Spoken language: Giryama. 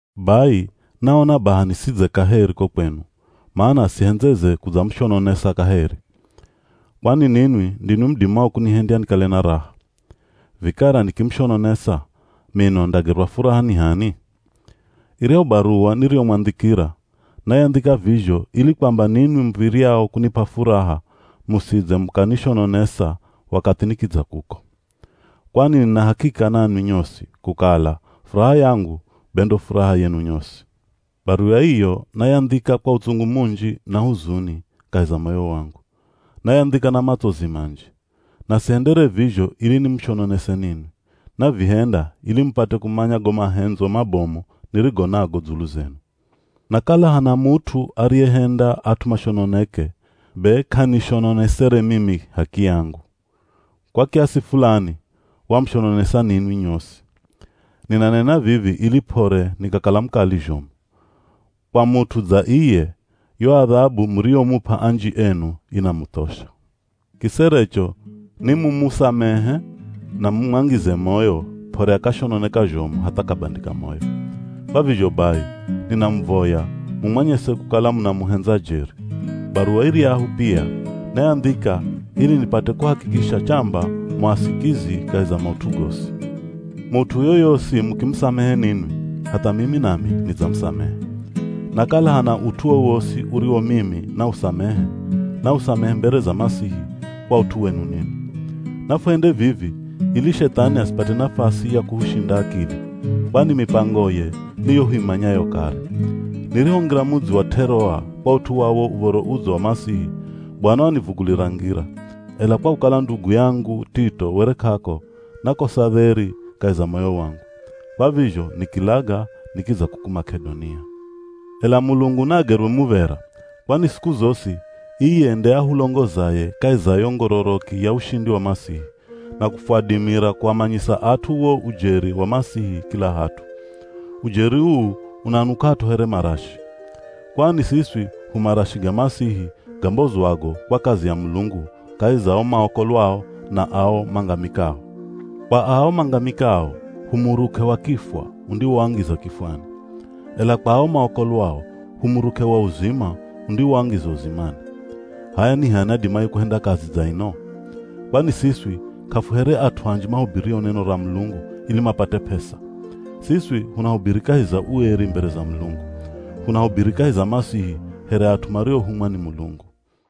Bai, naona baha nisidze kaheri ko kwenu, mana sihendzeze kudzamushononesa kaheri. Kwani ninwi ndinwi mudimao kunihendya nikale na raha. Vikara nikimushononesa, mino ndagerwa furaha ni h'ani? Iryahu baruwa niriyomwandhikira, nayandhika vizho ili kwamba ninwi muv̱iryao kunip'a furaha musidze mukanishononesa wakathi nikidza kuko. Kwani nina hakika nanwi nyosi, kukala furaha yangu be ndo furaha yenu nyosi. Baruwa iyo nayandhika kwa utsungu munji na huzuni kahi za moyo wangu. Nayandhika na matsozi manji. Na sihendere vizho ili nimushononese ninwi, navihenda ili mupate kumanya go mahendzo mabomu nirigo nago dzulu zenu. Na kala hana mut'u ariyehenda at'u mashononeke, be k'anishononesere mimi h'akiyangu. Kwa kiasi fulani wamushononesa ninwi nyosi. Ninanena vivi ili p'ore nikakala mukali zhomu. Kwa mut'u dza iye, yo adhabu muriyomup'a anji enu inamuthosha. Kiserecho ni mumusamehe na mumwangize moyo p'ore akashononeka zhomu hatha akabandika moyo. Kwa vizho bai, ninamuvoya mumwanyese kukala munamuhendza jeri. Baruwa iryahu pia, nayandhika ili nipate kuhakikisha chamba mu asikizi kahi za maut'u gosi. Mut'u yoyosi mukimusamehe ninwi, hatha mimi nami nidzamusamehe. Na kala hana ut'u wowosi uriwo mimi nausamehe, nausamehe mbere za Masihi kwa ut'u wenu ninwi. Nafuhende vivi ili Shethani asipate nafasi ya kuhushinda akili, kwani mipangoye ni yo huimanyayo kare. Nirihongira mudzi wa T'eroa kwa ut'u wa wo Uv̱oro Udzo wa Masihi, Bwana wanivugulira ngira, ela kwa kukala ndugu yangu Tito were k'ako, nakosa dheri kahi za moyo wangu. Kwa vizho nikilaga nikidza kuku Mak'edonia. Ela Mulungu naagerwe muv̱era; kwani siku zosi, iye nde ahulongozaye kahi za yo ngororoki ya ushindi wa Masihi, na kufwadimira kuamanyisa at'u wo ujeri wa Masihi kila hat'u. Ujeri uu unanuk'at'o here marashi. Kwani siswi hu marashi ga Masihi gambozwago kwa kazi ya Mulungu kahi za ao maokolwao na ao mangamikao. Kwa ao mangamikao, hu muruk'e wa kifwa undiwoangiza kifwani. Ela kwa ao maokolwao hu muruk'e wa uzima undiwoangiza uzimani. H'aya ni h'ani adimaye kuhenda kazi dza ino? Kwani siswi k'afuhere at'u anji mahubirio neno ra Mulungu ili mapate p'esa! Siswi hunahubiri kahi za ueri mbere za Mulungu. Hunahubiri kahi za Masihi here at'u mariohumwa ni Mulungu.